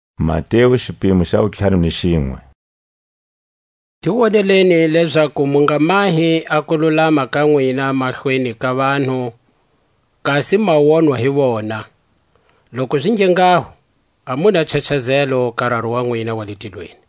Wuhana. Ti woneleni lezaku mu nga mahi a kululama ka nwina mahlweni ka vanhu, kasi ma wonwa hi vona; loku zi nge nghaho a mu na nchachazelo ka Raru wa nwina wa le tilweni.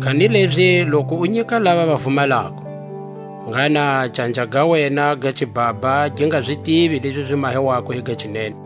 Kanilezi loku u nyika lava va vumalako, ngha na canja ga wena ga xibhabha gi nga zi tivi lezi zi mahiwako hi ga xinene,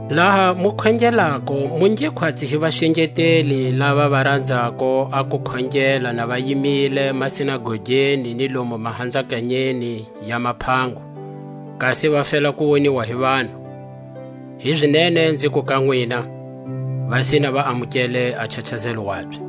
Laha mu khongelako, mu nge khwatsi hi vaxengeteli, lava va ranzako a ku khongela na va yimile masinagogeni ni lomu mahanzakanyeni ya maphango, kasi va fela ku woniwa hi vanhu. Hizinene nziku ka nwina, va sina va amukele a nchachazelo wabye.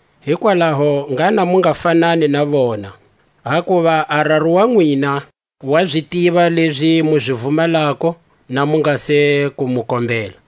Hikwalaho ngha na mu nga fanani na vona; hakuva a Raru wa nwina wa zi tiva lezi mu zi vumalako, na mu nga se ku mu kombela.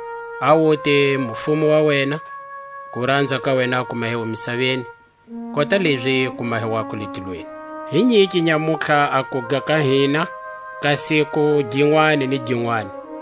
A wute mufumo wa wena. Kuranza ka wena a ku mahiwe misaveni, kota lezi ku mahiwako le tilweni. Hi nyike nyamutlha a kuga ka hina ka siku ginwani ni ginwani.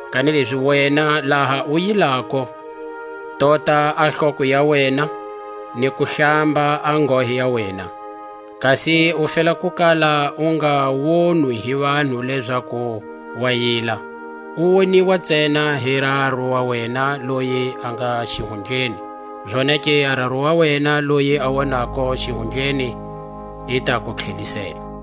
Kanilezi wena laha u yilako, tota a hloko ya wena, ni ku hlamba a nghohe ya wena, kasi u fela ku kala u nga wonwi hi vanhu lezaku wa yila, u woniwa ntsena hi Raru wa wena loyi a nga xihundleni; zonake a Raru wa wena loyi a wonako xihundleni, i ta ku tlhelisela. A titshomba.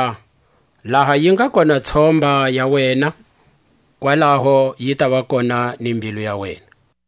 hakuva laha yi nga kona tshomba ya wena, kwalaho yi tava kona ni mbilu ya wena.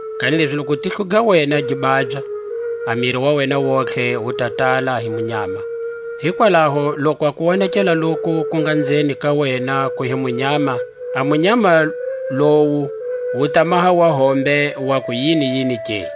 Kanilezi loku tihlo ga wena gi babya, a miri wa wena wontihe wu ta tala hi munyama. Hikwalaho loku a kuwonekela loku ku nga nzeni ka wena ku hi munyama, a munyama lowu wu ta maha wa hombe wa ku yiniyini ke!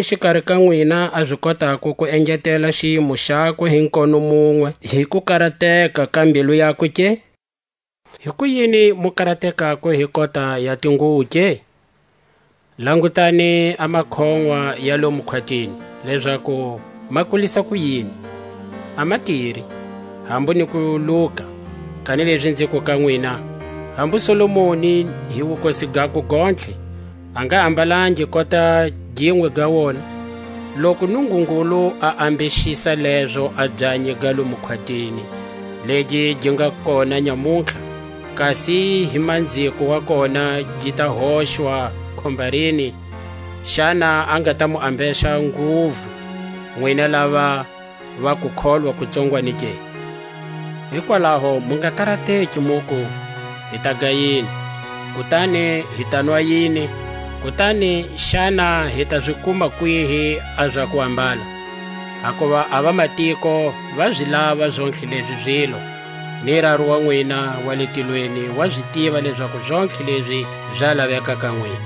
Himani xikari ka nwina a zi kotako ku engetela xiyimo xakwe hi nkono munwe hi kukarateka ka mbilu yakwe ke? Hikuyini mu karatekako hi kota ya tinguwo ke? Langutani a makhonʼwa ya lomu khwatini, lezaku ma kulisa kuyini; a ma tiri, hambu ni ku luka; kanilezi nziku ka nwina, hambu Solomoni hi wukosi gakwe gontlhe a nga ambalangi kota ginwe ga wona. Loku Nungungulu a ambexisa lezo a byanyi ga lomu khwatini, legi gi nga kona nyamutlha, kasi hi manziko wa kona gi ta hoxwa khombarini, xana a nga ta mu ambexa nguvu, nwina lava va kukholwa ku tsongwanyani ke? Hikwalaho mu nga karateki, muku; Hi taga yini? kutani, Hi tanwa yini? kutani, Xana hi ta zi kuma kwihi a za kuambala? Hakuva a vamatiko va zi lava zontlhe lezi zile; ni Raru wa nwina wa le tilweni wa zi tiva lezaku zontlhe lezi za laveka ka nwina.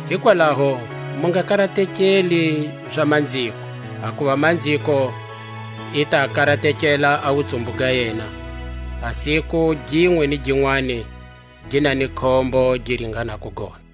Hikwalaho mu nga karatekeli za manziko; hakuva manziko i ta karatekela a wutsumbu ga yena. A siku ginwe ni ginwani gi na ni khombo gi ringanako gona.